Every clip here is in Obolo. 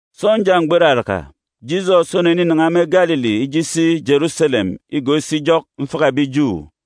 Sọnja mgbọ iraraka, Jisọs oneninan̄a me Galili ije isi Jeruselem igọọk isi ijọk mfaka ebi Ju.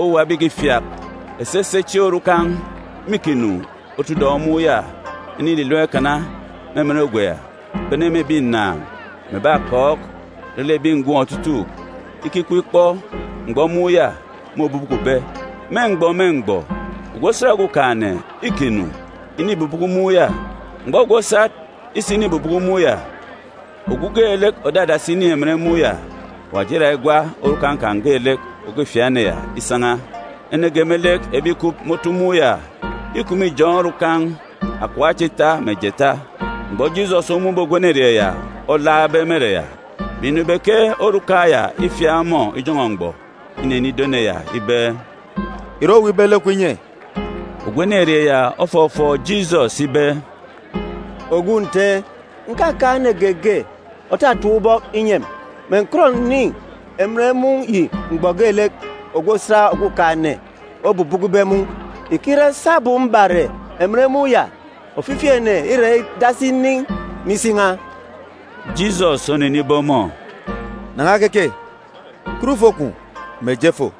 Owuwa ebi ìkifiak esese chieen̄ orukan̄ mîkinu otu udọn̄ mun̄ ya inililam ikana me emen ogwe cha, bene me ebi ǹnàan̄, mè ebi akọọk, re lek ebi ngọm otutuuk, [ikikup ikpọ mgbọ mun̄ ya môbubukube. Me mgbọ me mgbọ, ogwu osat Okumugwem îkinu inibubuku mun̄ ya. Mgbọ ogwu osat isinibubuku mun̄ ya, ogwu geelek òdadasi inin̄ emen mun̄ ya, Awaji îra igwa orukan̄ geelek òkifiak ene ya isan̄a.] Ene ge me lek ebi ìkup me otu mun̄ ya îkup me ijọn̄ orukan̄ akọp acha ita mè jeeta. Mgbọ Jisọs omun̄be ogwu enerieen̄ ya olaakbe me ere ya, mè inọ ibe ke orukan̄ ya îfiak ọmọ ijọn̄ọ mgbọ, inenido ene ya ibe, “Ìre oweek ibe lek kwun̄ inye?” Ogwu enerieen̄ ya ofọfọọk Jisọs ibe, “Ogwu Nte, ǹkakaan̄ ene geege òtatap ubọk inyi emi, mè ǹkọt ǹnin̄ emen mun̄ yi mgbọ geelek ogwu osat Okumugwem obubukube mun̄. Ìkire sabum mbare emen mun̄ ya, ofifi ene îra idasi inin̄ me isi n̄a.” Jisọs onenibe ọmọ, “Nan̄a keke, kat ufo kwun̄, mè je fo.”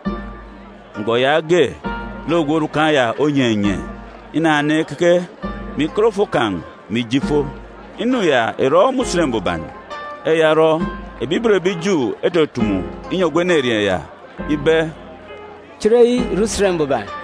Mgbọ yaage, lek ogwu orukan̄ ya onyenye, inanan̄a ikeke, mè ikat ufo kan̄, mè ije ifo. Inu ya ìrọ me Usen Mbuban. Eya orọ, ebi ibot ebi Ju etutumu inyi ogwu enerieen̄ ya ibe, “Chereyi ìre Usen Mbuban,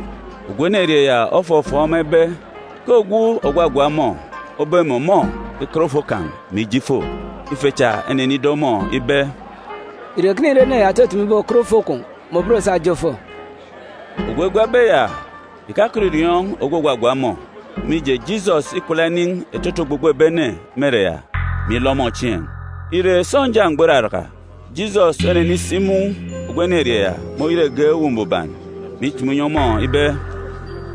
Ogwu enerieen̄ ya ofọfọọk ema ibe ke ogwu ògwagwa ọmọ obe mè ọmọ ikat ufo kan̄, mè ije ifo. Ife cha enenido ọmọ ibe, “Ìre ekene ire ene ya òtutumu ibe owu òkat ufo kwun̄, mè òben òsa òje òfo?” Ogwu egwabe ya ìkakọt ìriọọn̄ ogwu ògwagwa ọmọ, mije, Jisọs îkwala inin̄ etete ogbogbo ebi ene me ere ya, mè ilọ ọmọ chieen̄. Ire, sọnja mgbọ iraraka, Jisọs onenisi imun̄ ogwu enerieen̄ ya me oyet egep Uwu Mbuban, mè itumu inyi ọmọ ibe,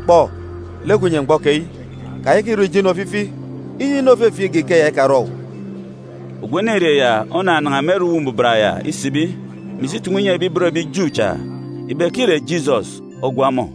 “Kpọ, lek kwun̄ înye mgbọ keyi. Kayaka ìrọ ijo inu ofifi, inyi inu òfefieek igak ikeya ikarọ owu.” Ogwu enerieen̄ ya onanan̄a me ere Uwu Mbuban ya isibi, mè isi itumu inyi ebi ibot ebi Ju cha, ibe ke îre Jisọs ogwa ọmọ.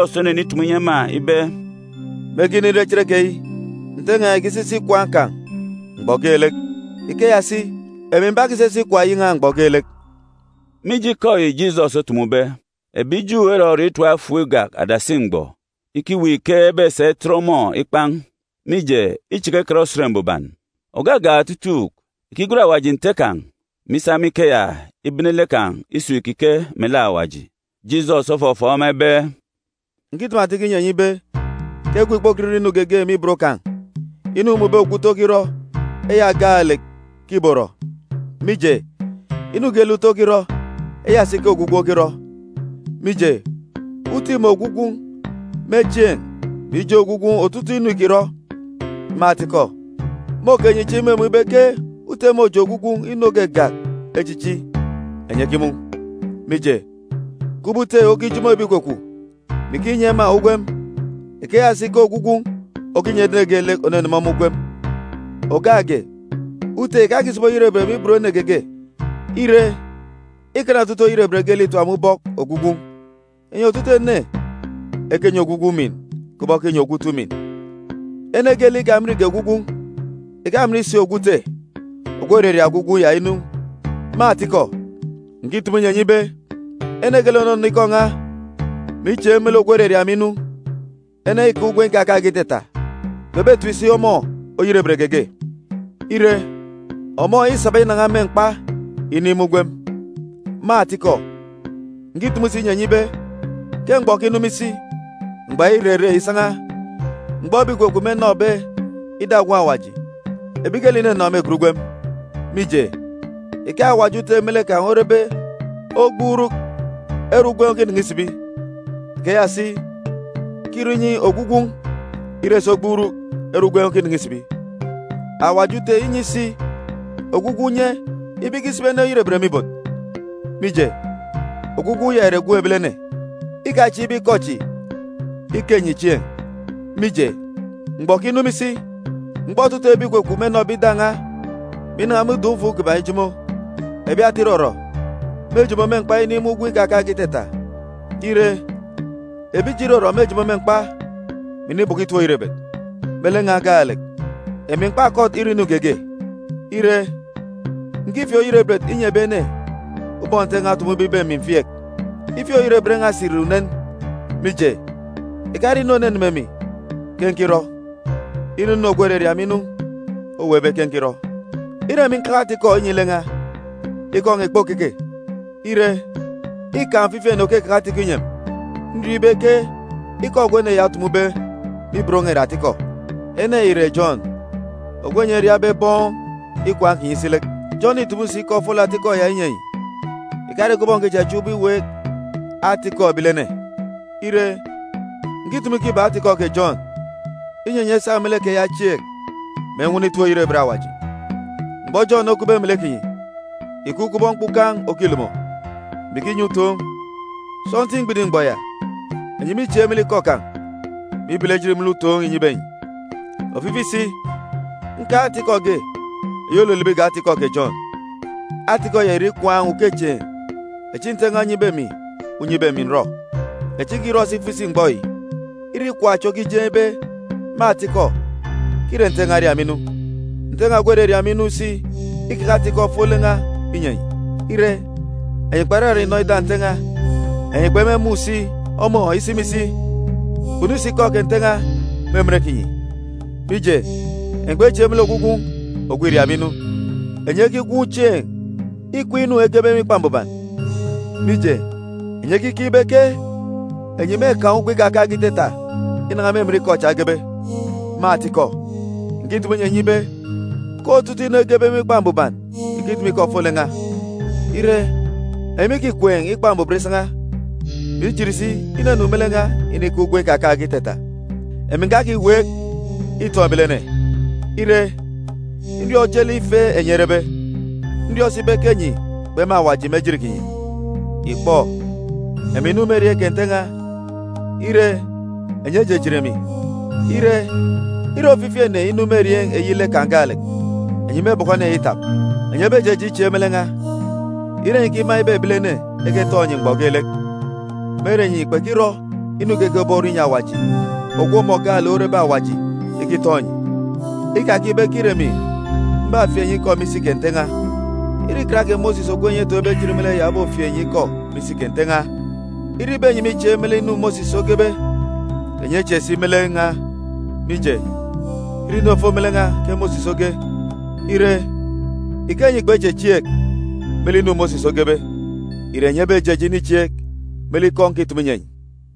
Jisọs onenitumu inyi ema ibe, “Mege inire cherekeyi, Nte n̄a ìkisisi ikwaan̄ kan̄ mgbọ geelek. Ikeya si, emi m̀bakisisi ikwaan̄ eyi n̄a mgbọ geelek.” Mije ikọ yi Jisọs otumube, ebi Ju erọriọọn̄ itap efuuk igak adasi mgbọ ikiweek ike ebesa itet ọmọ ikpan̄, mije, îchaka ikan Usen Mbuban. Ògagak otutuuk, ìkigwen Awaji Nte kan̄, mè isa me ikeya ibene lek kan̄ isun̄ ìkike melek Awaji. Jisọs ofọfọọk ema ibe, “Ǹkitumu atikọ inyi enyi ibe ke Gwun̄ ìkpokọt irọ inu geege me ibot kan̄. Inu îmun̄be ogwu Ute okirọ, eya gaalek ke ìborọ, mije, inu geelek Ute okirọ, eya si ke ogwu Gwun̄ okirọ. Mije, Ute îmun̄ ogwu Gwun̄ me chieen̄, mè ijeen̄ ogwu Gwun̄ otutuuk inu îkirọ. Me atikọ, môke enyi chieen̄ imumun̄ ibe ke Ute môjeen̄ ogwu Gwun̄ inu ògagak echichi enyi ekimun̄. Mije, kubọk Ute okijomo ebi ìkwakwaan̄, mè ikinyi ema ugwem, ikeya si ke ogwu Gwun̄ okinyi ene geelek òneneme ọmọ ugwem. Ògak ge, Ute ìkakisibi oyerebet me ibot ene geege. Ire, îkana otutuuk oyerebet geelek itap me ubọk ogwu Gwun̄, inyi otutuuk ene ekenyi ogwu Gwun̄ umin kubọk ekinyi ogwu Ute umin. Ene geelek ikaminge ogwu Gwun̄, ìkamin si ogwu Ute ogwu òraria ogwu Gwun̄ ya inu. “Me atikọ, ǹkitumu inyi enyi ibe, ene geelek ònọnọ ikọ n̄a, mè ichieek me lek ogwu òraria emi inu, ene ya îkaan̄ ugwem ikakaan̄ge itata. Kpebetip si ọmọ oyerebet geege. Ire, ọmọ îsaba inan̄a me mkpa inin̄ me ugwem. Me atikọ, ǹkitumu si inyi enyi ibe ke mgbọ òkinu me isi, mgbọ ya îrere isan̄a, mgbọ ebi ìkwakwaan̄ mênọbe ida Gwun̄ Awaji. Ebi geelek ìnọnọ mêgat ugwem. Mije, ike Awaji Ute me lek kan̄ orebe ogbuuruk ere ugwem okinan̄a isibi, ikeya si ke îrọ inyi ogwu Gwun̄ ire si ogbuuruk ere ugwem okinan̄a isibi. Awaji Ute înyi si ogwu Gwun̄ unye ibe ikisibi ene oyerebet me ibot, mije, ogwu Gwun̄ ya ìre Gwun̄ Ebilene. “Ikachieek ibe ikọ chi ike enyi chieen̄, mije, mgbọ òkinu me isi, mgbọ otutuuk ebi ìkwakwaan̄ mênọbe ida n̄a, mè inan̄a me udọn̄-ufuun̄ kiban̄ ijomo. Ebi ata irọrọ mêjomo me mkpa inin̄ me ugwem ikakaan̄ge itata. Ire, ebi ijo irọrọ mêjomo me mkpa, mè inibọkọ itip-oyerebet. Me lek n̄a gaalek, emi m̀kpakọt irọ inu geege. Ire, ǹkifieek oyerebet inyi ebi ene ubọk Nte n̄a otumube ibe emi m̀fieek. Ifieek-oyerebet n̄a si ìre unen, mije, ìkare inu òneme emi ke nkirọ. Îre inu ogwu òraria emi inu oweekbe ke nkirọ.” “Ire emi nkeke ata-ikọ inyi lek n̄a, ikọ n̄a ìkpokeke. Ire, îkaan̄ ofifi ene òkekeke ata-ikọ inyi emi. Nriọọn̄ ibe ke ikọ ogwu ene ya otumube me ibot n̄a ìre atikọ. Ene ya ìre Jọn, ogwu enyi eriabe bọn ikwaan̄ kinyi isi lek. Jọn îtumu si ikọ ofolek atikọ ya inyi enyi. Ìkare kubọk ǹkichachiaan̄ ubọk iweek ata-ikọ ebilene. Ire, ǹkitumu ikọ ibak ata-ikọ kè Jọn, inyi enyi esa me lek keya echieek, mè enwọnọ itip-oyerebet Awaji. Mgbọ Jọn okupbe melek kinyi, ìkup kubọk mkpukan̄ òkilomo, mè ikinyi utoon̄. Sọntiik mgbidim mgbọ ya, enyi mîchieek me lek ikọ kan̄, mè ibele ejit me lek utoon̄ înyibe enyi. “Ofifi si, nkaan̄ ata-ikọ ge eyi òlolobo igak ata-ikọ kè Jọn. Ata-ikọ ya ìre ikwaan̄ ukechieen̄ echi Nte n̄a onyibe emi unye ibe emi ǹrọ, echi nkirọ si ifo isi mgbọ yi. Îre ikwaan̄ chi okijeen̄ ibe, me atikọ, ke îre Nte n̄a oria emi inu. Nte n̄a ogwu òraria emi inu si îkeke ata-ikọ ofolek n̄a inyi enyi. Ire, enyi kperarak inọ ida Nte n̄a, enyi kpemumun̄ si ọmọ isi mè isi. Kpunu si Ikọ kè Nte n̄a me emen kinyi, mije, enyi kpechieek me lek ogwu Gwun̄ ogwu îriabe inu. Enyi ekigwuun̄ chieen̄ ikween̄ inu egebe me Ikpa Mbuban, mije, enyi ekikeek ibe ke enyi mêkaan̄ ugwem ikakaan̄ge itata inan̄a me emen ikọ cha egebe. Me atikọ, ǹkitumu inyi enyi ibe ke otutuuk inu egebe me Ikpa Mbuban ìkitumu ikọ ofolek n̄a. Ire, enyi mîkikween̄ Ikpa Mbuban isan̄a, mè ijit si inunu me lek n̄a inikaan̄ ugwem ikakaan̄ge itata. “Emi ǹkakiweek itọn̄ ebilene. Ire, nriọọn̄ ojelek ife enyi erebe. Nriọọn̄ si ibe ke enyi kpema Awaji me ejit kinyi. Ìkpọ, emi ǹnu me erieen̄ kè Nte n̄a. Ire, enyi ejijit emi. Ire, ire ofifi ene inu me erieen̄ eyi lek kan̄ gaalek, enyi mêbọkọ ene ya itap. Enyi ebejeje ichieek me lek n̄a, ire enyi ikima ibe ebilene eketọn̄ enyi mgbọ geelek, me ere enyi kpekirọ inu geege òborọ inyi Awaji, ogwu ọmọ gaalek orebe Awaji, ikitọn̄ enyi? “Ikakeek ibe ke îre emi mbafieek enyi ikọ me isi kè Nte n̄a. Îre Ikan kè Mosis ogwu enyi etoon̄be ejit me lek ya obofieek enyi ikọ me isi kè Nte n̄a. Ire ibe enyi mîchieek me lek inu Mosis ogebe, kè enyi echieek si me lek n̄a, mije, îre inu òfo me lek n̄a ke Mosis oge. Ire, ike enyi kpechechieek me lek inu Mosis ogebe, ìre enyi ebejeje inichieek me lek ikọ nkitumu inyi enyi?”